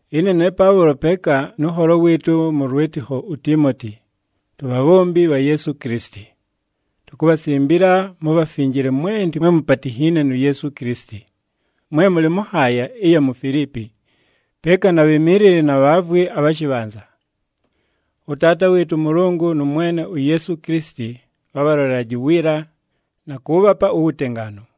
Ɨne ne Paʉlo peeka nʉ nholo wɨɨtʉ mʉ lwɨtɨkho uTiimoti, tubhabhombi bha Yeesu Kilisiti. Tukubhasimbila mubhafinjile mwenti mwe mupatinhiine nu Yeesu Kilisiti, mwe mʉlɨ mʉ nhaaya ɨya mu Filiipi, peeka na bhimiilili na bhaavwi abha shɨbhanza. ɄTaata wɨɨtʉ ʉMʉlʉngʉ nʉ Mwene uYeesu Kilisiti bhabhalolelaje uwiila, na kʉʉbhapa uwutengaanu.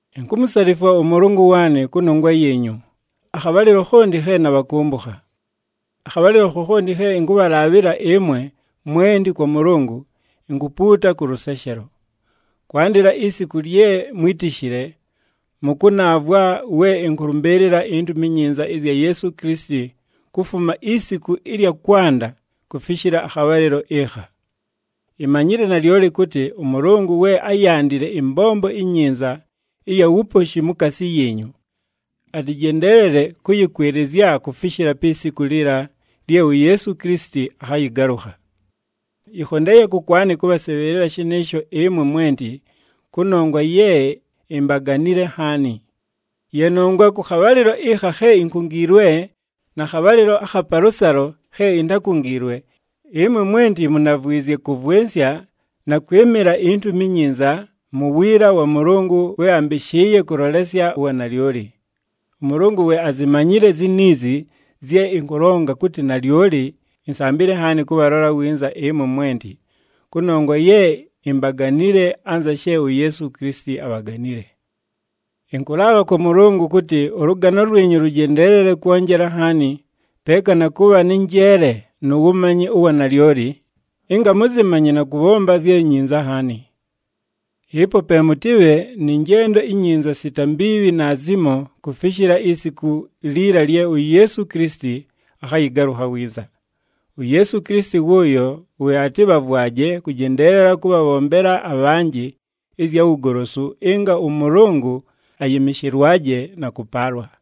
Inkumusalifwa ʉMʉlʉngʉ waanɨ kʉnongwa yiinyu akhabhalɨlo khonti khe nabhakʉmbʉkha. Akhabhalɨlo khokhonti khe ɨnkʉbhalaabhɨla ɨmwe mwenti kwa Mʉlʉngʉ, inkupuuta kʉ lʉseshelo. Kwandɨla isiku lye mwítishile, mʉkʉnaavwa we ɨnkʉlʉmbɨɨlɨla iNtumi iNyinza ɨzya Yeesu Kilisiti kufuma isiku ɨlya kwanda kufishila akhabhalɨlo ɨkha. Imanyile nalyoli kʉtɨ, ʉMʉlʉngʉ we áyandile ɨmbombo inyinza ɨya wuposhi mukaasi yiinyu, atɨjendeelele kʉyɨkwɨlɨzya kufishila pi siku liila lye uYeesu Kilisiti akhayɨgalʉkha. Yɨkhondeeye kʉkwanɨ kʉbhasɨbhɨɨlɨla shɨnɨɨsho ɨmwe mwenti, kʉnongwa ye imbaganile nhaani. Ye nongwa kʉ khabhalɨlo ɨkha khe inkungiilwe na khabhalɨlo akha palʉsalo khe intákungiilwe, ɨmwe mwenti munavwizye kʉvwɨnsya na kwɨmɨla iNtumi iNyinza mu wiila wa Mʉlʉngʉ we ambɨshɨɨye kʉlolesya uwanalyoli. ɄMʉlʉngʉ we azimanyile ziniizi zye ɨnkʉlonga kʉtɨ nalyoli insambile nhaani kʉbhalola winza ɨmwe mwenti, kʉnongwa ye imbaganile anza she uYeesu Kilisiti abhaganile. Ɨnkʉlaabha kwa Mʉlʉngʉ kʉtɨ ʉlʉgano lwinyu lʉjendeelele kwonjela nhaani, peeka na kʉbha nɨ njeele nu wumanyi ʉwa nalyoli, ɨnga mʉzɨmanye na kʉbhomba zye nyinza nhaani. Ɨpo pe mʉtɨbhe nɨ njendo inyinza sita mbiibhi naazimo kufishila isiku liila lye uYeesu Kilisiti akhayɨgalʉkha winza. UYeesu Kilisiti wʉʉyo we atɨbhavwaje kʉjendeelela kʉbhabhombela abhanjɨ ɨzya wugolosu, ɨnga ʉMʉlʉngʉ ayɨmɨshɨlwaje na kʉpaalwa.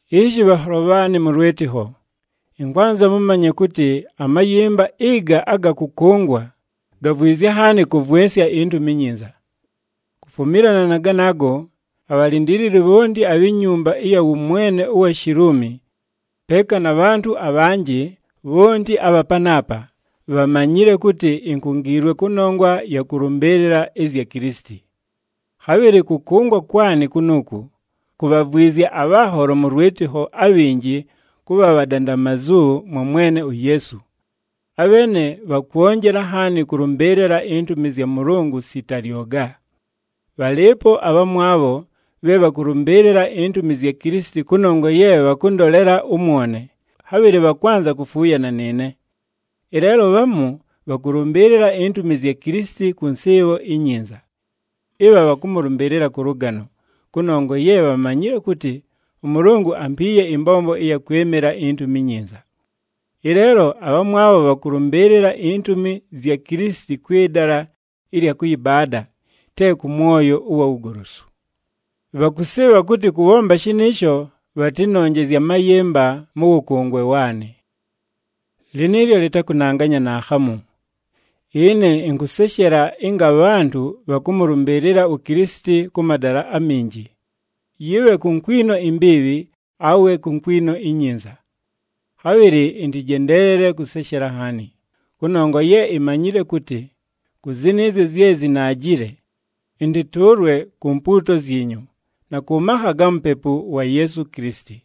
Ishi bhanholo bhaanɨ mʉ lwɨtɨkho, ɨnkwanza mʉmanye kʉtɨ amayɨmba ɨga aga kʉkʉngwa, gavwizye nhaani kʉvwɨnsya iNtumi iNyinza. Kufumilana na ganaago, abhalindiilili bhonti abhi nyumba ɨya wʉmwene ʉwa Shiluumi peeka na bhantʉ abhanjɨ bhonti abha panaapa, bhamanyile kʉtɨ inkungiilwe kʉnongwa ɨya kʉlʉmbɨɨlɨla ɨzya Kilisiti. Khabhɨlɨ kʉkʉngwa kwanɨ kunuuku, kubhavwizye abhanholo mʉ lwɨtɨkho abhinji kʉbha bhadandamazu mwa Mwene uYeesu. Abheene bhakwonjela nhaani kʉlʉmbɨɨlɨla intumi zya Mʉlʉngʉ sita lyoga. Bhalɨɨpo abhamwabho bhe bhakʉlʉmbɨɨlɨla intumi zya Kilisiti kʉnongwa ye bhakʉndolela ʉmwone, khabhɨlɨ bhakwanza kufuuyana nɨɨne. Ɨleelo bhamu bhakʉlʉmbɨɨlɨla intumi zya Kilisiti kʉ nsɨɨbho inyinza. Ɨbha bhakʉmʉlʉmbɨɨlɨla kʉ lʉgano, kʉnongwa ye bhamanyile kʉtɨ ʉMʉlʉngʉ ampiiye ɨmbombo ɨya kwɨmɨla iNtumi iNyinza. Ɨleelo abhamwabho bhakʉlʉmbɨɨlɨla intumi zya Kilisiti kwɨ dala ɨlya kʉyɨbaada, te kʉ mwoyo ʉwa wugolosu. Bhakʉsɨɨbha kʉtɨ kʉbhomba shɨnɨɨsho bhatɨnonjezye amayɨmba mʉ wʉkʉngwe waanɨ. Lɨnɨɨlyo lɨtakʉnanganya naakhamu! Ɨne ɨnkʉseshela ɨnga abhantʉ bhakʉmʉlʉmbɨɨlɨla uKilisiti kʉ madala aminji, yɨbhe ku nkwino imbiibhi awe ku nkwino inyinza. Khabhɨlɨ ɨntɨjendeelele kʉseshela nhaani, kʉnongwa ye imanyile kʉtɨ, kʉ zɨnɨɨzyo zye zinaajile, ɨntɨtʉʉlwe ku mpuuto zyinyu na kʉ makha ga Mupepu wa Yeesu Kilisiti.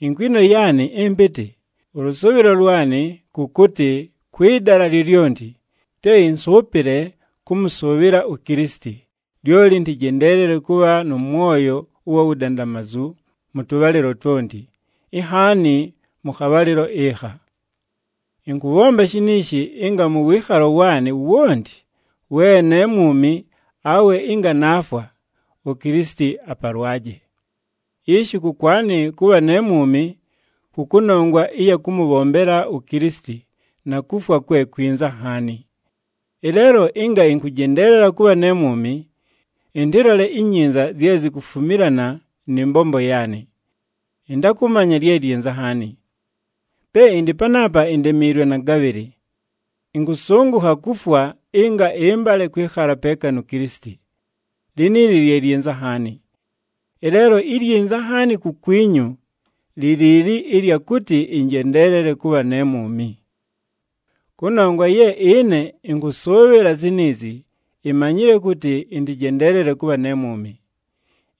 Inkwino yaanɨ ɨmpɨtɨ, nʉ lʉsʉʉbhɨlo lwanɨ kʉ kʉtɨ kwɨ dala lyolyonti, te ɨnsʉʉpɨle kʉmʉsʉʉbhɨla uKilisiti, lyoli ɨntɨjendeelele kʉbha nʉ mwoyo ʉwa wudandamazu mʉ tʉbhalɨlo twonti, inhaani mʉ khabhalɨlo ɨkha. Ɨnkʉbhomba shiniishi ɨnga mʉ wɨɨkhalo waanɨ wonti, we ne mwumi awe ɨnga naafwa, uKilisiti apalwaje. Ishi kʉkwanɨ, kʉbha ne mwumi kʉ kʉnongwa ɨya kʉmʉbhombela uKilisiti, na kufwa kwe kwinza nhaani. Ɨleelo ɨnga ɨnkʉjendeelela kʉbha ne mwumi, ɨntɨlole inyinza zye zikufumilana nɨ mbombo yaanɨ. Ɨntakʉmanya lye lyinza nhaani. Pe ɨndɨ panaapa, indemiilwe na gabhɨlɨ. Ɨnkʉsʉngʉkha kufwa ɨnga ɨmbale kwɨkhala peeka nu Kilisiti. Liniili lye lyinza nhaani. Ɨleelo ilyinza nhaani kukwinyu li liili ɨlya kʉtɨ ɨnjendeelele kʉbha ne mwumi. Kʉnongwa ye ɨne ɨnkʉsʉʉbhɨla ziniizi, imanyile kʉtɨ ɨntɨjendeelele kʉbha ne mwumi.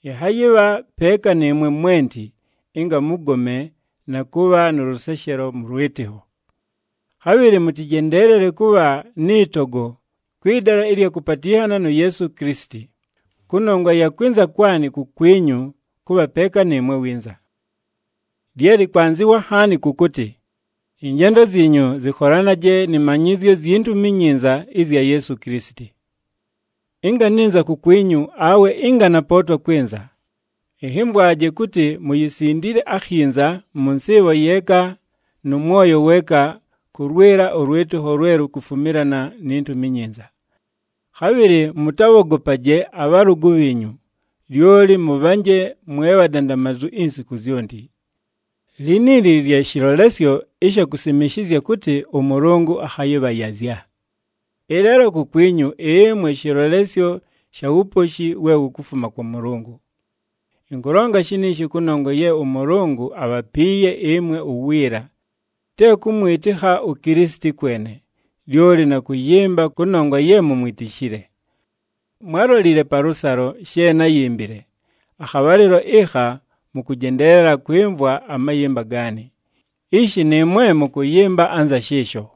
Ɨnhayɨbha peeka nɨɨmwe mwenti, ɨnga mʉgome na kʉbha nʉ lʉseshelo mʉ lwɨtɨkho. Khabhɨlɨ mʉtɨjendeelele kʉbha nɨ togo kwɨ dala ɨlya kʉpatɨnhana nu Yeesu Kilisiti, kʉnongwa ya kwɨnza kwanɨ kukwinyu kʉbha peeka nɨɨmwe winza. Lye lɨkwanzɨwa nhaani kʉ kʉtɨ, ɨnjendo zyinyu zɨkholanaje nɨ manyɨzyo zyi Ntumi iNyinza ɨzya Yeesu Kilisiti. Ɨnga nɨnza kukwinyu awe ɨnga napootwa kwɨnza, ɨnhɨmvwaje kʉtɨ muyisindile akhinza mʉ nsɨɨbho yeeka nʉ mwoyo weeka kʉlwɨla ʉlwɨtɨkho lwe lukufumilana ni Ntumi iNyinza. Khabhɨlɨ mʉtabhogopaje abhalʉgʉ bhiinyu, lyoli mʉbhanje mwe bhadandamazu insiku zyonti. Liniili lye shɨlolesyo ɨsha kusimishizya kʉtɨ ʉMʉlʉngʉ akhayɨbhayazya. Ɨleelo kukwinyu ɨmwe shɨlolesyo sha wuposhi we wukufuma kwa Mʉlʉngʉ. Ɨnkʉlonga shiniishi kʉnongwa ye ʉMʉlʉngʉ abhapiiye ɨmwe uwiila, te kʉmwɨtɨkha uKilisiti kwene, lyoli na kʉyɨmba kʉnongwa ye mumwitishile. Mwálolile palʉsalo she náyimbile, akhabhalɨlo ɨkha mʉkʉjendeelela kwɨmvwa amayɨmba gaanɨ. Ishi nɨɨmwe mʉkʉyɨmba anza shɨɨsho.